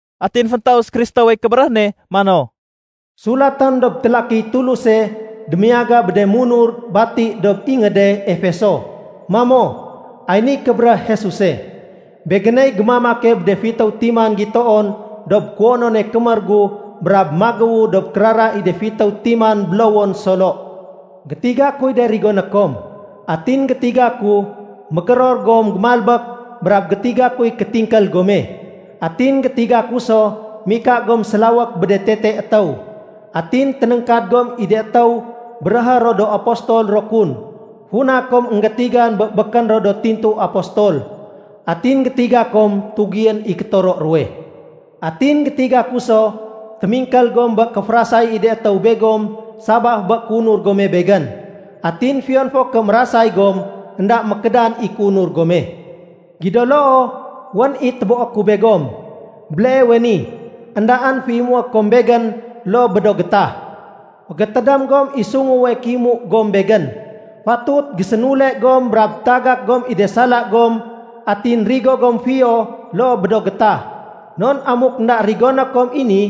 Atin féntaus Kristowey kébéréh ne mano, “Sulatém dob télakiy Tuluse démiyaga bé de munur bati dob ingéde Efeso mamo, ‘Ay niy kébéréh Jesuse. Begéney gémamake bé de fitéw timan gitoon dob kuwonone kémér gu brab magéwe dob kérara i de fitéw timan bélowon solo. Gétiga kuy de rigoné kom, atin gétiga ku mégéror gom gémalbék brab gétiga kuy kétingkél gome. Atin gétiga ku so mika gom sélawék bé de tete étéw. Atin ténéngkad gom i de étéw béréhé ro do apostol ro kun funa kom énggétigan bé békén ro do tintu apostol. Atin gétiga kom tugién i kétoro ruwe. Atin gétiga ku so témingkél gom bé kéférasay i de étéw begom sabaf bé kéunur gome Begén. Atin fiyon fo ké mérasay gom, énda mékédan i kéunur gome. Gido loo, wén i téboé ku begom. Béleewe ni, éndaén féimué kom Begén loo bé do gétah. Fégétédém gom i sunguwe kéimu gom Begén. Fatut gésénule gom brab tagak gom i de sala gom atin rigo gom fiyo loo bé do gétah. Non amuk énda rigoné kom i ni,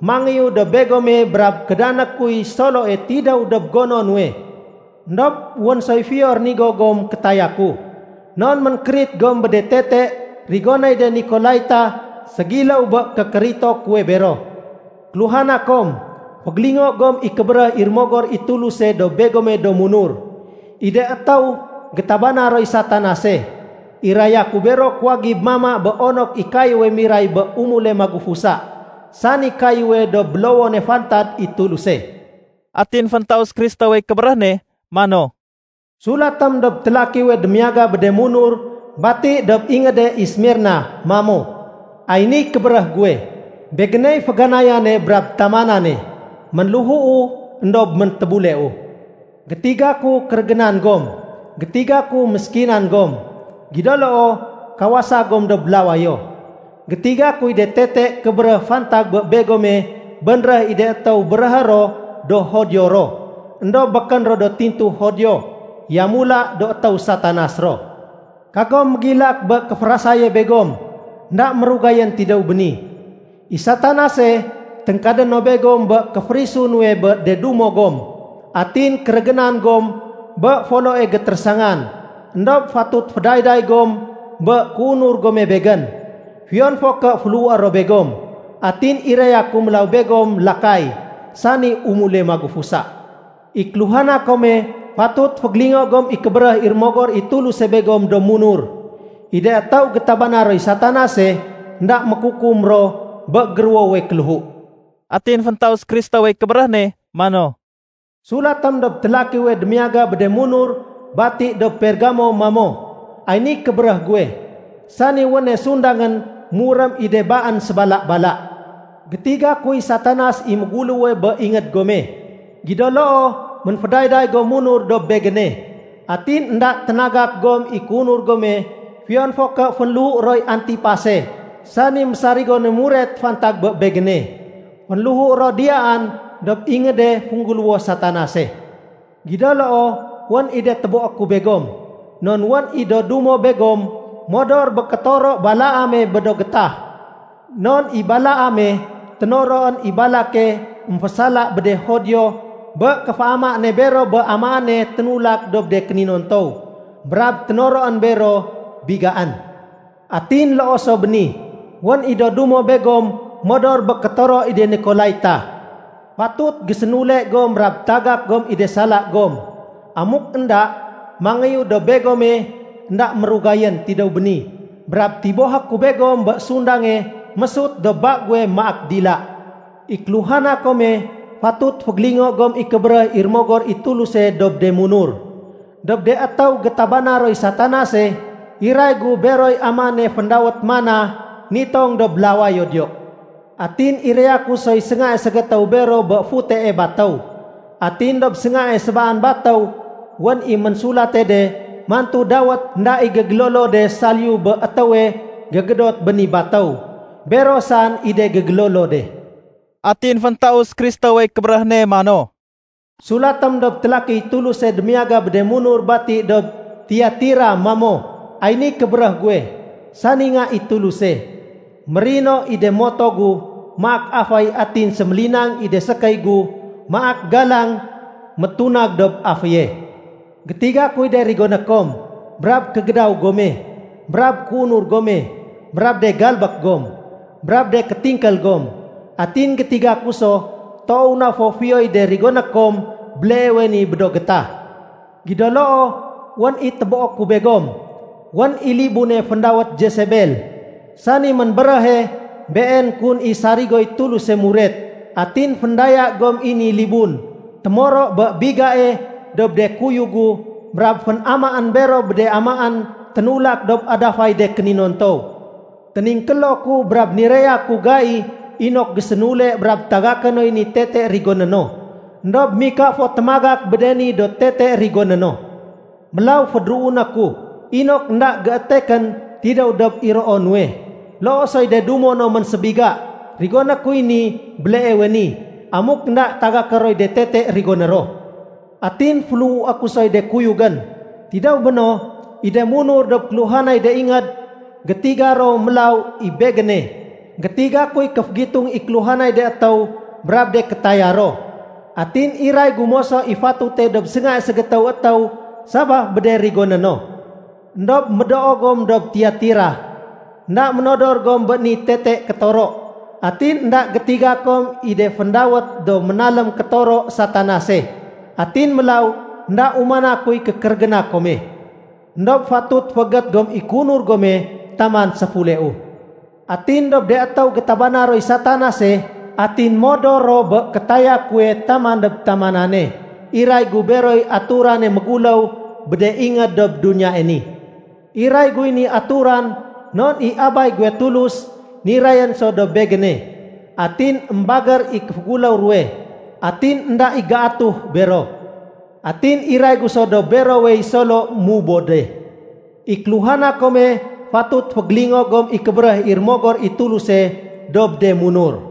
mangéyu dob begome brab kédané kuy soloe tidéw dob gono nuwe. Endob wén soy fiyo rénigo gom kétaya ku. Non ménkérit gom bé de tete rigonéy de Nikolaita ségiléw bé kékérito kuwe bero. “ ‘Kéluhana kom, fégélingo gom i kébéréh i Rémogor i Tuluse dob begome do munur. “ ‘I de étéw gétabana roy Satanase, iraya ku bero kuwagib mama bé onok i kayéwe miray bé umule magufusa, sani kayéwe dob bélowone fantad i Tuluse.’” Atin féntaus Kristowey kébéréh ne mano, “Sulatém dob télakiwe démiyaga bé de munur bati dob ingéde Esmirna mamo, ‘Ay niy kébéréh guwe. Begéney féganayane brab tamanane. Ménléhuu éndob méntébuleu. Gétiga ku kérégénan gom. Gétiga ku méskinan gom. Gido loo, kawasa gom dob lawayo. Gétiga kuy de tete kébéréh fantag bé begome bénréh i de étéw béréhé ro do Judio ro. Endob békén ro do tintu Judio, yamula do étéw Satanas ro. Kagom mégilak bé kéférasaye begom énda mérugayén tidéw béni. I Satanase, téngkadé no begom bé kéféférisu nuwe bé de dumo gom. Atin kérégénan gom bé foloe gétérésangan. Endob fatut fédayday gom bé kéunur gome Begén, fiyon fo ké féléhué ro begom. Atin iraya ku mélaw begom lakay, sani umule magufusa. “ ‘I kéluhana kome, fatut fégélingo gom i kébéréh i Rémogor i Tuluse begom do munur. “ ‘I de étéw gétabana roy Satanase, énda mékukum ro bé géruwowe kéléhu.’” Atin féntaus Kristowey kébéréh ne mano, “Sulatém dob télakiwe démiyaga bé de munur bati dob Pergamo mamo, ‘Ay niy kébéréh guwe, sani wéne sundangén murém i de baén sébala-bala. Gétiga kuy Satanas i méguléwe bé ingéd gome, gido loo ménfédayday gom munur dob Begéne. Atin énda ténagak gom i kéunur gome fiyon fo ké fénléhu roy Antipase sani mésarigone muret fantag bé Begéne. Fénléhu ro diyaan dob ingéde féngguléwo Satanase. Gido loo, wén i de téboé ku begom. Non wén i do dumo begom modor bé kétoro Balaame bé do getah. Non i Balaame, ténoroén i Balake émfésala bé de Judio bé kéféama ne bero bé amaéne ténulak dob de kéninontow. Brab ténoroén bero bigaén. Atin loo so bé ni, wén i do dumo begom modor bé kétoro i de Nikolaita. Fatut gésénule gom brab tagak gom i de sala gom. Amuk énda, mangéyu dob begome énda mérugayén tidéw béni brab tibohé ku begom bé sundange mésut dob ba guwe maak dila. “‘I kéluhana kome, fatut fégélingo gom i kébéréh i Rémogor i Tuluse dob de munur. “‘Dob de étéw gétabana roy Satanase, iray gu beroy amaéne féndawét mana nitong dob lawayo diyo. Atin iraya ku soy séngae ségétéw bero bé futee batéw. Atin dob séngae sébaan batéw wén i ménsulate de mantu dawét énda i gégélolo de saliyu bé étéwe gégédot bé ni batéw. Bero saén i de gégélolo de.’” Atin féntaus Kristowey kébéréh ne mano, “Sulatém dob télakiy Tuluse démiyaga bé de munur bati dob Tiatira mamo, ‘Ay niy kébéréh guwe, sani Nga i Tuluse. Mérino i de moto gu maak aféy atin sémélinang i de sékéy gu maak galang métunag dob aféye. Gétiga kuy de rigoné kom, brab kégédaw gome, brab kéunur gome, brab de galbék gom, brab de kétingkél gom. Atin gétiga ku so toow na fo fiyoy de rigoné kom béleewe ni bé do gétah. Gido loo, wén i téboé ku begom. Wén i libune féndawét Jesebel, sani ménbéréhe been kun i sarigoy Tuluse muret. Atin féndaya gom i ni libun témoro bé bigae dob de kuyug gu brab fénamaén bero bé de amaén ténulak dob adafay de kéninontow. Téningkélo ku, brab niraya ku gai inok gésénule brab tagaké noy ni tete rigoné no. Endob mika fo témagak bé de ni do tete rigoné no. Mélaw fédéruuné ku inok énda géétekén tidéw dob iroo nuwe, loo soy de dumo no ménsébiga. Rigoné kuy ni béleewe ni, amuk énda tagaké roy de tete rigoné ro. Atin féléhué ku soy de kuyugén. Tidéw béno, i de munur dob kéluhanay de ingéd, gétiga ro mélaw i Begéne, gétiga kuy kéfégitung i kéluhanay de étéw brab de kétaya ro. Atin iray gu moso i fatute dob séngae ségétéw étéw sabaf bé de rigoné no. “‘Endob médoo gom dob Tiatira, énda ménodor gom bé ni tete kétoro. Atin énda gétiga kom i de féndawét do ménalém kétoro Satanase. Atin mélaw énda umana kuy kékérégéna kome. Endob fatut féégét gom i kéunur gome taman séfuleu. Atin dob de étéw gétabana roy Satanase atin modor ro bé kétaya kuwe taman dob tamanane, iray gu beroy aturane méguléw bé de ingéd dob duniyae ni. Iray guy ni aturan non i Abay guwe Tulus nirayén so dob Begéne. Atin émbagér i kéféguléw ruwe, atin énda i géatuh bero. Atin iray gu so dob berowey solo mubode. “‘I kéluhana kome fatut fégélingo gom i kébéréh i Rémogor i Tuluse dob de munur.’”